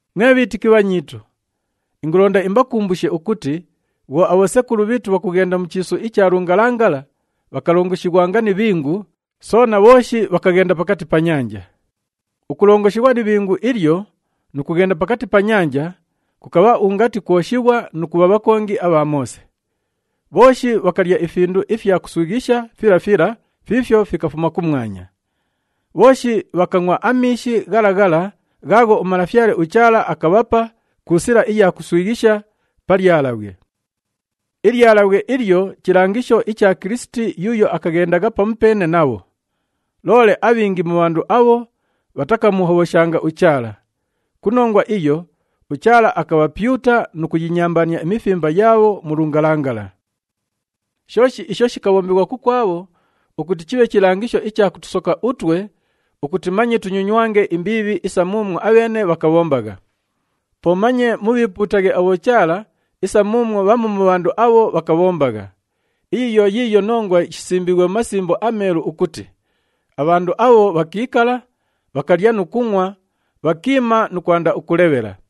Mwe bhiitiki bhanyiitu, ingulonda imbakumbushe ukuti bhwo abhosekulu bhiitu bhakughenda mu chiisu icha lungalangala, bhakalongoshighwanga ni ibhingu, soona bhooshi bhakaghenda pakati pa nyanja. Ukulongoshighwa ni ibhingu ilyo nu kughenda pakati pa nyanja, kukabha ungati kwoshighwa nu kubha bhakongi abha Moose. Bhooshi bhakalya ifindu ifya kuswighisha fila fila fiifyo fikafuma kumwanya. Bhooshi bhakangʼwa amiishi ghala ghala ghaagho uMalafyale uChaala akabhapa ku sila iya kuswighisha pa lyalabhwe. Ilyalabhwe ilyo chilangisho icha Kilisiti yuuyo akaghendagha pamupeene nabho. Loole abhingi mu bhandu abho bhatakamuhobhoshanga uChaala. Ku nongwa iyo, uChaala akabhapyuta nu kuyinyambaania imifimba yaabho mu lungalangala. Shooshi isho shikabhombighwa kukwabho ukuti chibhe chilangisho icha kutusoka utwe ukuti manye tunyonywange imbiibhi isa muumwo abheene bhakabhombagha. Po manye mubhiipuutaghe abhochaala isa muumwo bhamu mu bhandu abho bhakabhombagha. Iyi yo yiiyo nongwa shisimbiighwe mu Masimbo aMeelu ukuti, “Abhandu abho bhakiikala, bhakalya nu kungʼwa, bhakiima nu kwanda ukulebhela.”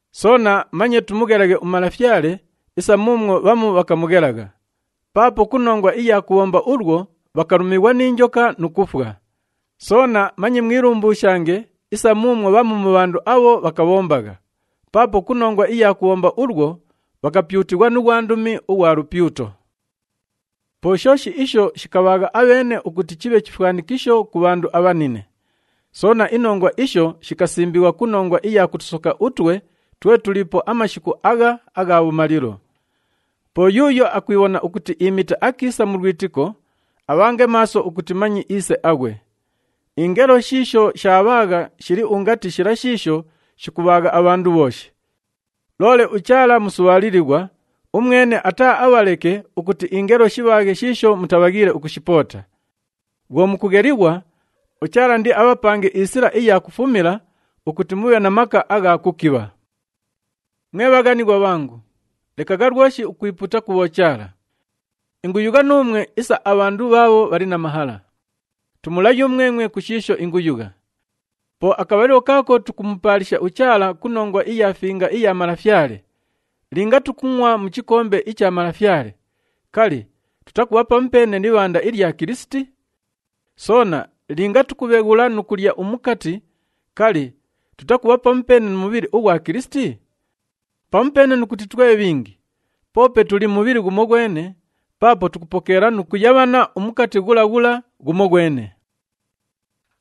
Soona manye tumughelaghe uMalafyale isa muumwo bhamu bhakamughelagha. Paapo ku nongwa iya kubhomba ulwo bhakalumighwa ni njoka nu kufwa. Soona manye mwilumbuushange isa muumwo bhamu mu bhandu abho bhakabhombagha. Paapo ku nongwa iya kubhomba ulwo bhakapyutighwa nu ghwandumi ughwa lupyuto. Po shooshi isho shikabhaagha abheene ukuti chibhe chifwanikisho ku bhandu abhanine. Soona, inongwa isho shikasimbighwa ku nongwa iya kutusoka utwe twe tuliipo amashiku agha agha bhumalilo. Po yuuyo akwibhona ukuti iimite akiisa mu lwitiko, abhange maaso ukuti manye iise aghwe. Ingelo shiisho shaabhaagha shili ungati shila shiisho shikubhaagha abhandu bhooshi. Loole uChaala musubhaalilighwa, umwene ataaabhaleke ukuti ingelo shibhaaghe shiisho mutabhaghiile ukushipoota. Bhwo mukughelighwa, uChaala indiabhapange isila iya kufumila ukuti mubhe na maka agha kukibha. Mwe bhaghanighwa bhangu, lekagha lwoshi ukwipuuta ku bhochaala. Inguyugha nuumwe isa abhandu bhaabho bhali na mahala. Tumula yumwemwe ku shiisho inguyugha. Po akabhalilo kaako tukumupaalisha uChaala ku nongwa iya Finga iya Malafyale, linga tukungʼwa mu chikombe icha Malafyale, kali, tutakubha pamupeene ni ibhanda ilya Kilisiti? Soona linga tukubheghula nu kulya umukati, kali, tutakubha pamupeene nu mubhili ughwa Kilisiti? Pamupeene nu kuti twe bhingi, poope tuli mubhili ghumoghwene paapo tukupokeela nu kuyabhana umukati ghula ghula ghumoghwene.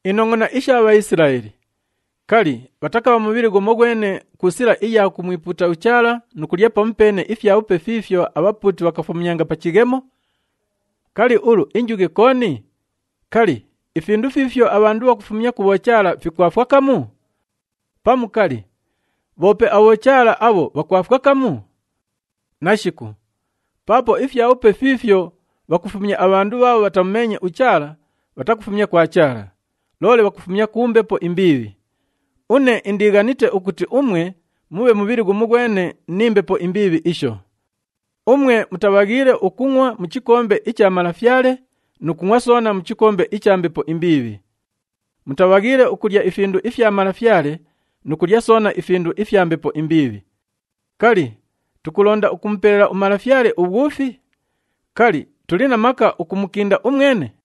Inongʼona isha Bhaisilaeli. Kali, bhatakabha mubhili ghumoghwene ku sila iya kumwipuuta uChaala nu kulya pamupeene ifyabhupe fiifyo abhapuuti bhakafumyanga pa chighemo? Kali, ulu injughe kooni? Kali, ifindu fiifyo abhandu bhakufumya ku bhochaala fikwafwa kamu? Pamu, kali, bhoope abhochaala abho bhakwafwa kamu? Nashiku! Paapo ifyabhupe fiifyo bhakufumya abhandu bhaabho bhatamumeenye uChaala bhatakufumya kwa Chaala, loole bhakufumya ku mbepo imbiibhi. Une indiighanite ukuti umwe mubhe mubhili ghumoghwene ni mbepo imbiibhi isho. Umwe mutabhaghiile ukungʼwa mu chikombe icha Malafyale nu kungʼwa soona mu chikombe icha mbepo imbiibhi. Mutabhaghiile ukulya ifindu ifya Malafyale nu kulya soona ifindu ifya mbepo imbiibhi. Kali, tukulonda ukumupelela uMalafyale ubhwufi? Kali, tuli na maka ukumukinda umwene?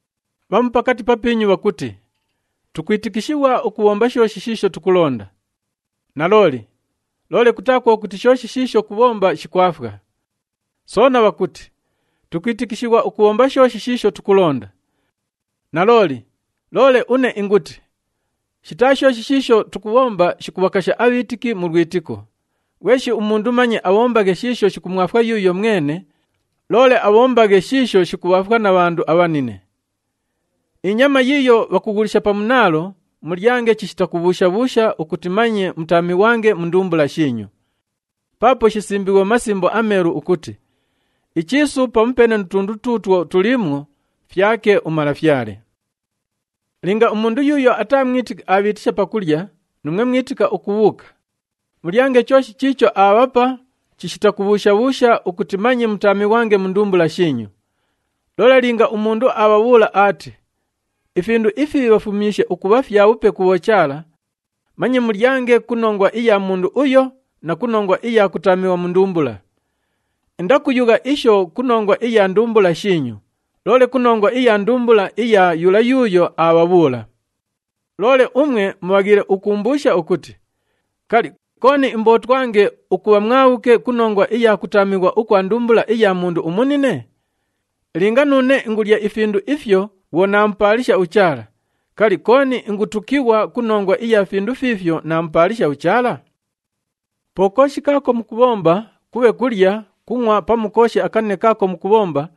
Bhamu pakati papiinyu bhakuti, “Tukwitikishighwa ukubhomba shooshi shiisho tukulonda.” Nalooli, loole kutaa kwo kuti shooshi shiisho kubhomba shikwafwa. Soona bhakuti, “Tukwitikishighwa ukubhomba shooshi shiisho tukulonda.” Nalooli, loole une inguti, shitaa shooshi shiisho tukubhomba shikubhakasha abhiitiki mu lwitiko. Ghweshi umundu manye abhombaghe shiisho shikumwafwa yuuyo mwene, loole abhombaghe shiisho shikubhaafwa na bhandu abhanine. Inyama yiiyo bhakughulisha pa munaalo, mulyange chishita kubhuusha-bhuusha ukuti manye mutaamighwange mu ndumbula shiinyu. Paapo shisimbiighwe mu Masimbo aMeelu ukuti, “Ichiisu pamupeene nu tundu tuutwo tuliimwo fyake uMalafyale.” Linga umundu yuuyo ataa mwitiki abhiitisha pakulya, nuumwe mwitika ukubhuuka, mulyange chooshi chiicho aabhapa chishita kubhuusha-bhuusha ukuti manye mutaamighwange mu ndumbula shiinyu. Loole linga umundu aabhabhuula aati, “Ifindu ifi bhafumyishe ukubha fyabhupe ku bhochaala,” manye mulyange ku nongwa iya mundu uyo na ku nongwa iya kutaamighwa mu ndumbula. Indakuyugha isho ku nongwa iya ndumbula shiinyu, loole ku nongwa iya ndumbula iya yula yuuyo aabhabhuula. Loole umwe mubhaghiile ukuumbuusha ukuti, “Kali, kooni imbootwange ukubha mwabhuke ku nongwa iya kutaamighwa ukwa ndumbula iya mundu umunine?” Linga nuune ingulya ifindu ifyo bhwo naamupaalisha uChaala, kali, kooni ingutukighwa ku nongwa iya findu fiifyo naamupaalisha uChaala? Po kooshi kaako mukubhomba, kubhe kulya, kungʼwa pamu kooshi akanine kaako mukubhomba,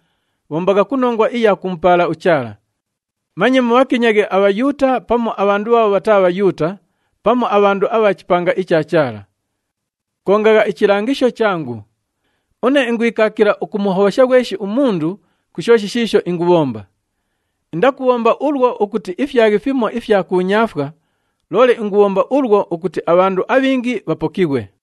bhombagha ku nongwa iya kumupaala uChaala. Manye mubhakinyaghe aBhayuuta pamu abhandu bhaabho bhataa Bhayuuta pamu abhandu abha chipanga icha Chaala. Kongagha ichilangisho changu. Une ingwikaakila ukumuhobhosha ghweshi umundu ku shooshi shiisho ingubhomba. Indakubhomba ulwo ukuti ifyaghe fimo ifya kuunyaafwa, loole ingubhomba ulwo ukuti abhandu abhingi bhapokighwe.